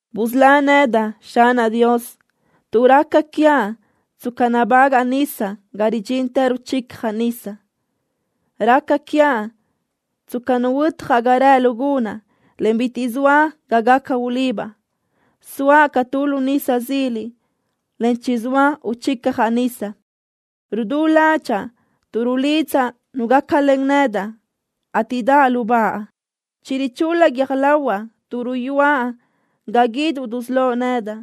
Busölá nedaʼ, Xanaʼ Dios, tuʼ raca quiaʼ tsca nabágaʼa nisa ga ridxintë ruchicjaʼ nisa. Raca quiaʼ tsca ruhuötjaʼ ga rëʼ lu gunaʼ, en bitiʼ zoa ga gaca ulibaʼ. Zoaʼ ca tu lu nisa zila, en chizóa uchicjaʼ nisa. Rudú ládxaʼa tuʼ rulidzaʼ nu gácalen nedaʼ, ateʼ daʼ lubáʼa. Chirichul-la guiö́j lahuaʼ tuʼ ruyúaʼ ga guíduʼ dusölóʼ nedaʼ.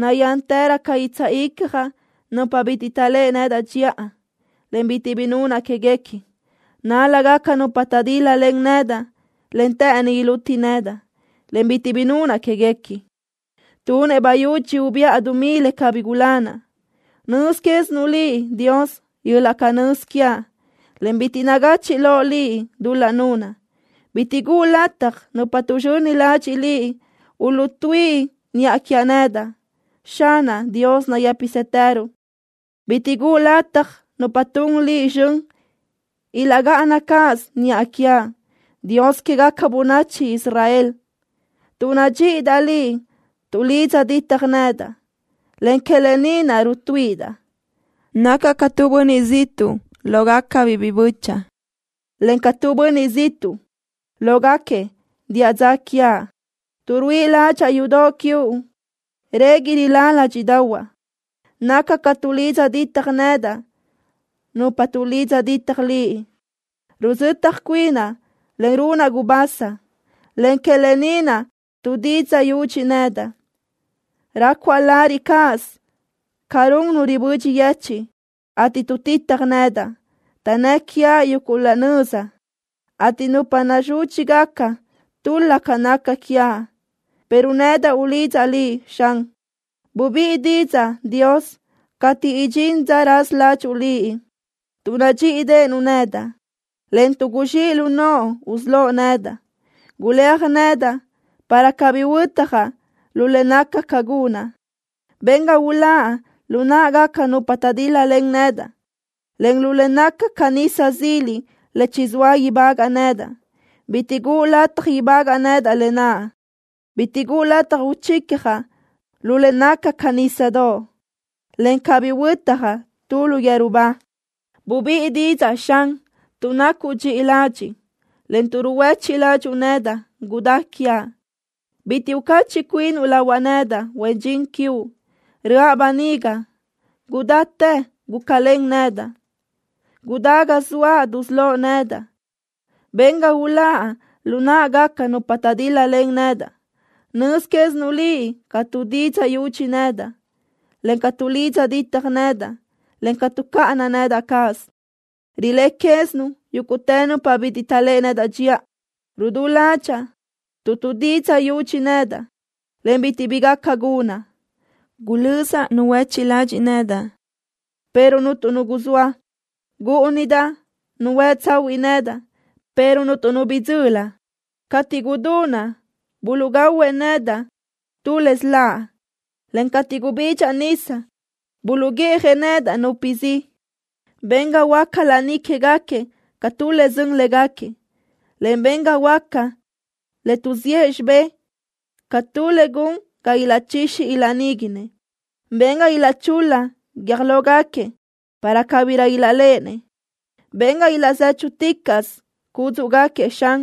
Nayántërö ca guitsaʼ icjaʼ nupa bitiʼ taʼléʼe nedaʼ dxiʼa, en bitiʼ bi nunaʼ quéguequi. Nál-lagaca nupa taʼdíl-lalen nedaʼ, en të́ʼëni iluti nedaʼ, en bitiʼ bi nunaʼ quéguequi. Tunëʼ bayúdx ubiʼa dumí le cabí gulanaʼ. Nöz quézinuʼ Liʼ, Dios, yöl-laʼ canö́z quiaʼ, en bitiʼ nagachiʼ loʼ Liʼ dul-laʼ nunaʼ. Bitiʼ guʼu lataj nupa tuʼzxöni ladxiʼ Liʼ uluʼtuíʼi niʼa quiaʼ nedaʼ, Xanaʼ Dios nayë́pisëtëruʼ. Bitiʼ guʼu lataj nupa tun Liʼ zxön ilaʼgáʼana cáʼasö niʼa quiaʼ, Dios quégaca bönachi Israel. Tuʼ nadxíʼidaʼ Liʼ tuʼlidza ditjëʼ nedaʼ, en que lë ni naʼ rutuíʼidaʼ. Nacaʼ ca tu bönniʼ ziʼtuʼ lógacabiʼ biʼi bö́chaʼa, en ca tu bönniʼ ziʼtuʼ lógaquiëʼ diʼa dza quiaʼ. Tuʼ ruíʼi ládxaʼa yudoʼ quiuʼ régui rilá ládxiʼdaʼahuaʼ. Naca ca tuʼlidza ditaj nedaʼ nupa tuʼlidza ditaj Liʼ. Ruzötaj cuinaʼ, en runaʼ gubasa, en que lë ni naʼ tuʼdidzaʼ yudxi nedaʼ. Rácuaʼ lariʼ cáʼasö ca run nu ribödxi yechiʼ, ateʼ tuʼtitaj nedaʼ. Taʼnnë́ʼ quiaʼ yuguʼ laʼ nöza, ateʼ nupa nazúdxigaca tul-la ca naca quiaʼ, pero nedaʼ ulidzaʼ Liʼ, Xan. Bubíʼi didzaʼ, Dios, cateʼ idxín dza raza ládxuʼu Liʼ tuʼ nadxíʼideʼenuʼ nedaʼ, en tuʼ guzxíʼ lu noʼo usölóʼ nedaʼ. Guléaj nedaʼ para cabí huötjaʼ lu le naca ca gunaʼ. Ben ga uláʼ lu náʼagaca nupa taʼdíl-lalen nedaʼ, en lu le naca ca nisa zila le chizóa ibagaʼ nedaʼ. Bitiʼ guʼu lataj ibagaʼ nedaʼ lë naʼ. Bitiʼ guʼu lataj uchicjaʼ lu le naca ca nísadoʼ, encaʼ cabí huötjaʼ tu lu yeru ba. Bubíʼi didzaʼ, Xan, tuʼ nacuʼ dxiʼi ladxiʼ, en tuʼ ruhuéchiʼ ládxuʼu nedaʼ, gudá quiaʼ. Bitiʼ ucachiʼ cuinuʼ lahuaʼ nedaʼ, huen dxin quiuʼ. ¡Röʼa böniga! ¡Gudáchi gúcalen nedaʼ! ¡Gudá ga zoaʼ dusölóʼ nedaʼ! ¡Ben ga uláʼ lu náʼagaca nupa taʼdíl-lalen nedaʼ! Nöz quézinuʼ Liʼ ca tuʼdidzaʼ yudxi nedaʼ, en ca tuʼlidza ditaj nedaʼ, en tuʼcáʼana nedaʼ cáʼasö. Riléʼe quézinuʼ yúguʼtë nupa bitiʼ taʼléʼe nedaʼ dxiʼa. Rudú ládxaʼa tuʼ tuʼdidzaʼ yudxi nedaʼ, en bitiʼ bi gaca gunaʼ. Gulözaʼ nu huéchiʼ ladxiʼ nedaʼ, pero cuntu nu guzóa. Gúʼunidaʼ nu huë tsahuiʼ nedaʼ, pero cuntu nu bidzöli. Cateʼ gudunaʼ buluʼgahuëʼ nedaʼ tu le siláʼ, en cateʼ gubidxaʼ nisa, buluʼguiʼjëʼ nedaʼ nupe zi. Ben ga huöáca laní quégaquiëʼ ca tu le sön légaquiëʼ, en ben ga huöáca le tuʼziʼë xibé ca tu le gun ga ilaʼchixi ilaʼníguinëʼ. Ben ga ichul-la guiö́j lógaquiëʼ para cabirö ilaʼléʼenëʼ. Ben ga ilaʼzéchuticaʼsö cúdzuʼgaquiëʼ zxan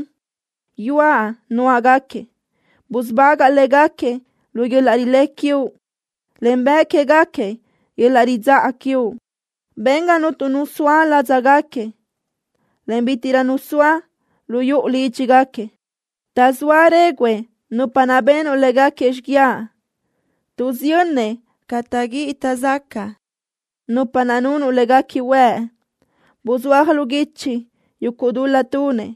yuaʼ nuáʼgaquiëʼ. Busubagaʼ légaquiëʼ lu yöl-laʼ rilé quiuʼ, en bëʼ quégaquiëʼ yöl-laʼ ridzáʼa quiuʼ. Ben ga cuntu nu soa ládzagaquiëʼ, en ga bítiʼrö nu soa lu yuʼu lídxigaquiëʼ. Taʼzóa réguʼë nupa naʼ benuʼ léguequi xiguiaʼ. Tuʼsiyönnëʼ ca taʼguíʼi taʼzacaʼ nupa naʼ nunuʼ léguequi huëʼ. Buzúaj lu guichi yuguʼ dul-laʼ tunëʼ,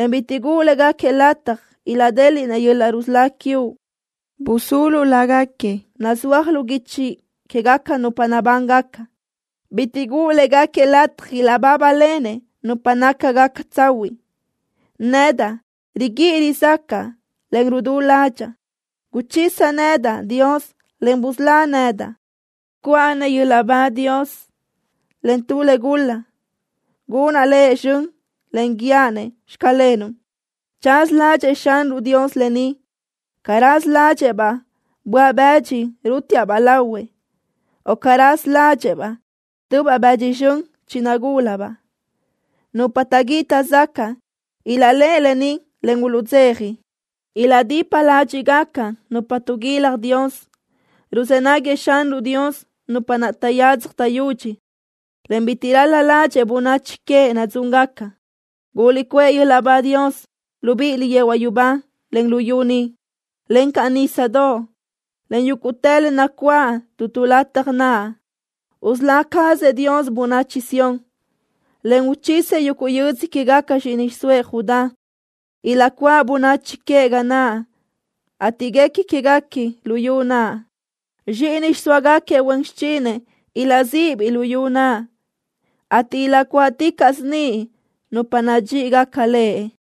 en bitiʼ guʼu légaquiëʼ lataj ilaʼdéliʼnëʼ yöl-laʼ rusölá quiuʼ. Busulu lágaquiëʼ nazúajgaca lu guichi quégaca nupa nabángaca. Bitiʼ guʼu légaquiëʼ lataj ilaʼbábalenëʼ nupa nácagaca tsahuiʼ. Nedaʼ riguíʼi rizácaʼa, en rudú ládxaʼa. Guchisa nedaʼ, Dios, en busölá nedaʼ. ¡Cuʼa-nëʼ yöl-laʼ ba Dios len tu le gul-laʼ! ¡Gunaʼ Lëʼ zxön, en guíaʼ-nëʼ: “Xclenuʼ”! Chaza ládxëʼë Xanruʼ Dios lë ni ca raza ládxëʼë-baʼ böaʼ-bëdxi rútiaʼ-baʼ lahuëʼ, o ca raza ládxëʼë-baʼ tubaʼ bëdxi zxön chinagúlabaʼ. Nupa taʼguíʼi taʼzacaʼ ilaʼléʼeni lë ni, en uluʼdzeja. Ilaʼdipa ládxiʼgaca nupa tuʼguilaj Dios. Ruzë́ naguëʼ Xanruʼ Dios nupa taʼyadzaj taʼyudxi, en bitiʼ ral-la ládxëʼë bönachi queëʼ nadzúngaca. ¡Guliʼcuʼë yöl-laʼ ba Dios, libíʼiliʼ yehuaʼ yubá, en luyú ni, encaʼ nísadoʼ, en yúguʼtë le nacuáʼ tu tu lataj naʼ! Usölá cazëʼ Dios bönachi Sión, en uchisëʼ yuguʼ yödzö quégaca zxíʼini xiʼsóëʼ Judá. Ilaʼcuáʼ bönachi queëʼ ga naʼ, ateʼ guequi quéguequi luyú naʼ. Zxíʼini xiʼsóagaquiëʼ huen xichinëʼ ilaʼzíʼibiʼ luyú naʼ, ateʼ ilaʼcuáʼticaʼsö niʼ nupa nadxíʼigaca Lëʼ.